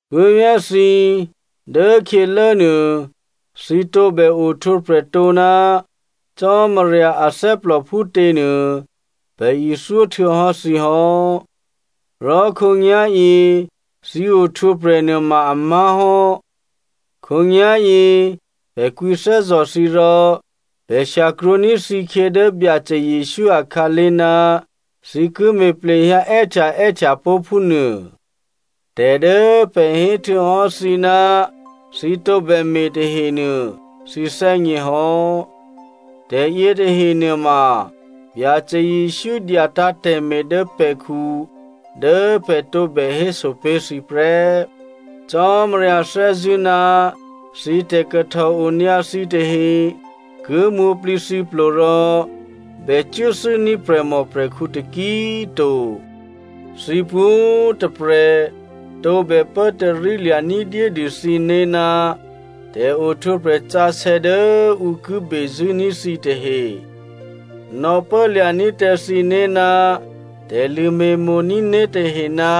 Puố̤vyá̤ thǐ, dố khyělốnuô, thǐ tǒbè ohtwǒprè̤ tǒ ná Cò́marya athè́plò phútěnuô, pè̤ ithyó htuô̌hò́ thǐ hò́. Rò khǒnyá̤yě thǐ ohtwǒprè̤ nuôma a má̤hò́. Khǒnyá̤yě pè̤ kwǐthè́zò̤ thǐ rò pè̤ shyakrwǒní̤ thǐkhyě dố Byacè Jesǔ akhǎlé̤, thǐ ki me̤ plehyǎ è́htyaè́htya pó̤ phúnuô. Tè̤ dố pè̤ hé htuô̌hò́ thǐ ná thǐ tǒbè me̤ tahenuô, thǐ thè́gněhò́. Tè̤ yětahe nuôma Byacè Jesǔ dyatǎ̤ tè̤me̤ dố pè̤khu dố pè̤ tǒbè héso pé̤ thǐ prè́. Cò́marya thè́zṳ̂́ ná thǐ tè̤kahtòonyǎ thǐtahe ki mwǒ̤plǐthǐplo rò bè cuốthû́ní̤ prè̤mòprè̤khǔ taki꤮ to. Thǐ pwǒ̤꤮ tôprè̤ tǒbè pốtarílya̤ ní̤dyédû thǐné̤ ná tè̤ohtwǒprè̤ sǎsè̌ dố ǔ ki bezṳ̂́ní̤ thǐ tahe. Nò̌pố lya̤ní̤ tǎ thǐné̤ ná tè̤lṳ̂me̤mo̤ní̤ né̤tahe ná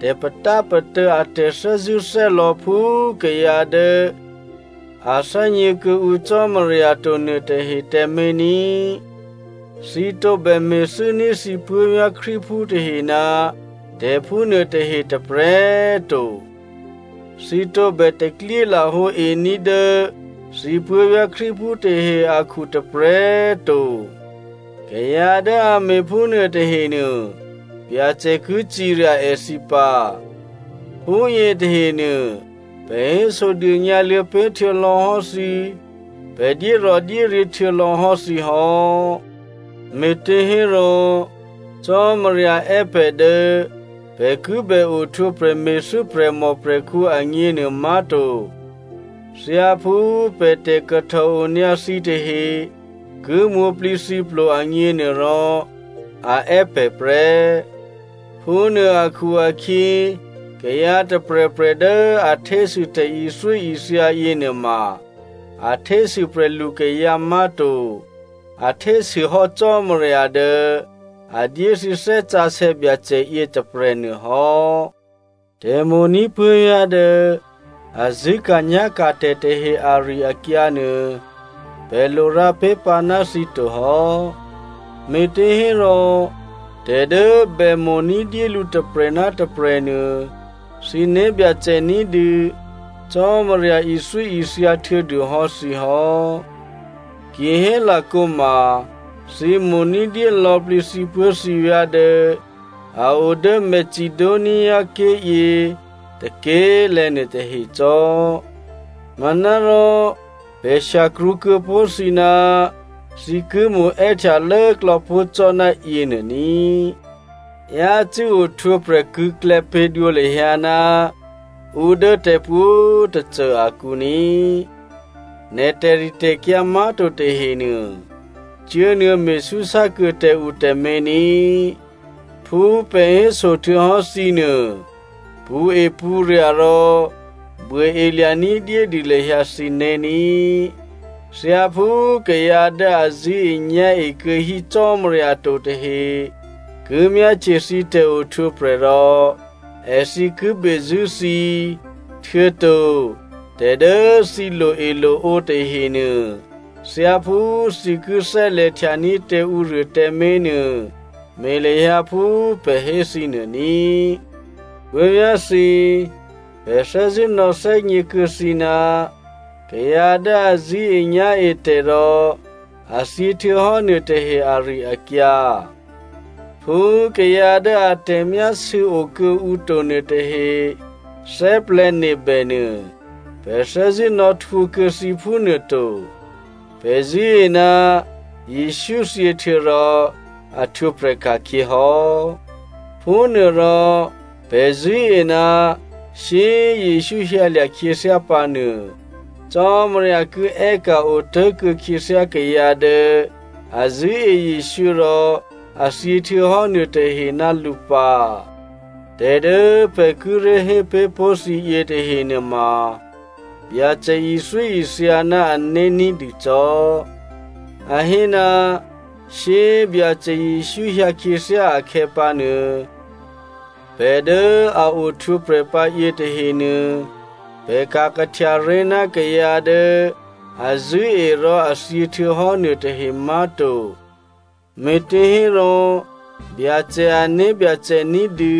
tè̤patápatô̌ a tè̤thè́zṳ̂́thè́lò̌ phú kayǎ dố a thè́gně kuô̌ǔ Cò́marya to nuôtahe tǎmé̤ ní꤮. Thǐ tǒbè me̤thû́ní̤ thǐ puố̤vyá̤ Krístuphú tahe ná tè̤ phúnuôtahe tôprè̤꤮ to. Thǐ tǒbè taklyé lahǒení̤ dố thǐ puố̤vyá̤ Krístuphú tahe akhu tôprè̤꤮ to. Kayǎ dố a me̤phúnuô tahenuô, Byacè ki cirya èthǐ pǎ. Phúyě tahenuô pè̤ hésodônyǎluô̌ pé̤ htuô̌lò̌hò́ thǐ, pè̤ dyérò̤dyéryě̤ htuô̌lò̌hò́ thǐ hò́. Me̤těhérò Cò́marya è́ pè̤ dố pè̤ ki bè ohtwǒprè̤ me̤thû́ prè̤mòprè̤khǔ agněnuô má̤to. Thyáphú pè̤ tè̤kahtòonyǎ thǐtahe ki mwǒ̤plǐthǐplo agněnuôrò, a è́ pè̤ prè́. Phúnuô akhu-akhyě, kayǎ tôprè̤prè̤ dố a htésû tè̤ithyóithya yěnuôma, a htésû prè̤lukayǎ má̤to. A htésûhò́ Cò́marya dố a dyé thǐ Thè́ Sǎsè̌ Byacè yětôprè̤ nuôhò́. Tè̤mo̤ní̤ puố̤vyá̤ dố a zṳ̂́ka̤nyá̤ka̤ tè̤ tahe ari-akyǎ nuô, pè̤ lo rǎ pé̤pǎ ná thǐ to hò́. Me̤těhérò tè̤ dố bè mo̤ ní̤dyé lǔ tôprè̤ ná tôprè̤ nuô thǐ né̤byacè ní̤dû, Cò́marya ithyóithya htuô̌dûhò́ thǐ hò́. Kihélakǒma thǐ mo̤ ní̤dyé lò̌plǐ thǐpuố̤thǐvyá̤ dố a o dố Macedoniaké̤ yě tôké̤lè̤̌ nuôtahe cò́. Manárò pè̤ shyakrwǒ kuô̌pó̤ thǐ ná thǐ ki mo̤ è́htya lốklò̌ pó̤ cò́ ná yěnuô ní. Yácû́ ohtwǒprè̤ krṳ̂̌klè̌ pě̤dwǒ lahyǎ ná ǔ dố tè̤pwǒ̤꤮ tôcô akǔ ní꤮. Nè̤ tè̤ritè̤kyǎ má̤to tahenuô, cuốnuô̌ me̤súsá kuô̌ tǎ ǔ tǎmé̤ ní꤮. Phú pè̤ héso htuô̌hò́ thǐ nuô, pṳ̌epṳ̌rya̤ rò buôelya̤ ní̤dyédû lahyǎ thǐné̤ ní꤮. Thyáphú kayǎ dố a zṳ̂́enyá̤e kuô̌hí Cò́marya to tahe ki myáhtye thǐ tè̤ohtwǒprè̤ rò èthǐ ki bezṳ̂́ thǐ, htuô̌to tè̤ dố thǐ loe loǒ tahenuô, thyáphú thǐ ki thè́lè̤htyaní̤ tǎ ǔruô tǎmé̤nuô, me̤ lahyǎ phú pè̤ hé thǐ nuô ní꤮. Puố̤vyá̤thǐ, pè̤ thè́zṳ̂́ nò̌thè́gněkuô̌ thǐ ná kayǎ dố a zṳ̂́enyá̤etè̤ rò a thyě htuô̌hò́ nuôtahe ari-akyǎ. Phú kayǎ dố a tè̤myásû̌ okuô̌ǔ to nuôtahe thè́plè̤̌nebè nuô, pè̤ thè́zṳ̂́ nò̌htwǒ kuô̌ thǐ phúnuôto. Pè̤ zṳ̂́e ná Jesǔ thyěhtuô̌ rò a htwǒprè̤ ka̤khyě hò́. Phúnuôrò pè̤ zṳ̂́e ná shyé꤮ Jesǔ hyǎlya̤ khyěthyá pǎnuô, Cò́marya ki è́ka̤ otố̤kuô̌ khyěthyá kayǎ dố a zṳ̂́e Jesǔ rò a thyě htuô̌hò́ nuôtahe ná lǔ pǎ. Tè̤ dố pè̤ kíré̤ hé pé̤ pó̤ thǐyě tahenuôma, Byacè ithyóithya ná ané̤ ní̤dûcò́. A hé, shyé꤮ Byacè Jesǔ hyǎ khyěthyá akhè̌pǎnuô, pè̤ dố a ohtwǒprè̤ pǎ yětahenuô, pè̤ ka̤ kahtyaré̤ ná kayǎ dố a zṳ̂́e rò a thyě htuô̌hò́ nuôtahe má̤to. Me̤těhérò Byacè ané̤byacè ní̤dû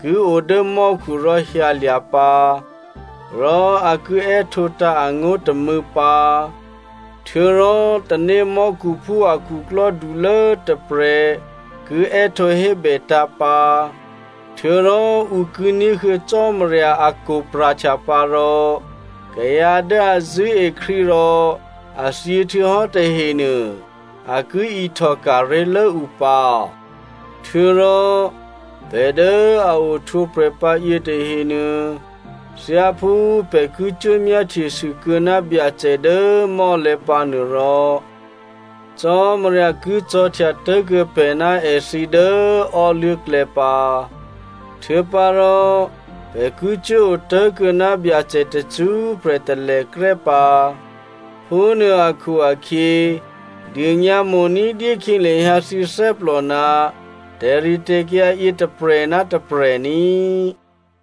ki o dố mò́khu rò hyǎlya̤ pǎ, rò a ki è́htǒtǎ̤ angó̤ tômû̌ pǎ. Htuô̌rò tanémò́khuphú a khuklò́dulố tôprè̤ ki è́htǒ hébètǎ̤ pǎ. Htuô̌rò ǔ ki ní̤huô̌ Cò́marya akwo̤ pra̤htya pǎ rò kayǎ dố a zṳ̂́e Krístu rò a thyě htuô̌hò́ tahenuô, a ki ihtò ka̤ré̤lố ǔ pǎ. Htuô̌rò pè̤ dố a ohtwǒprè̤pǎ yětahenuô, thyáphú pè̤ ki cuố myáhtyesû kuô̌ ná Byacè dố mò́lè̤̌ pǎnuôrò, Cò́marya ki cò̤̌htya tố̤kuô̌ pè̤ ná èthǐ dố ò́luố̤klè̌ pǎ. Htuô̌pǎrò pè̤ ki cuố otố̤kuô̌ ná Byacè tacṳ́prè̤ talèkrè́ pǎ. Phúnuô akhu-akhyě, dônyǎ mo̤ ní̤dyé khyě lahyǎ thǐ thè́plò ná tè̤ritè̤kyǎ yě tôprè̤ ná tôprè̤ ní꤮.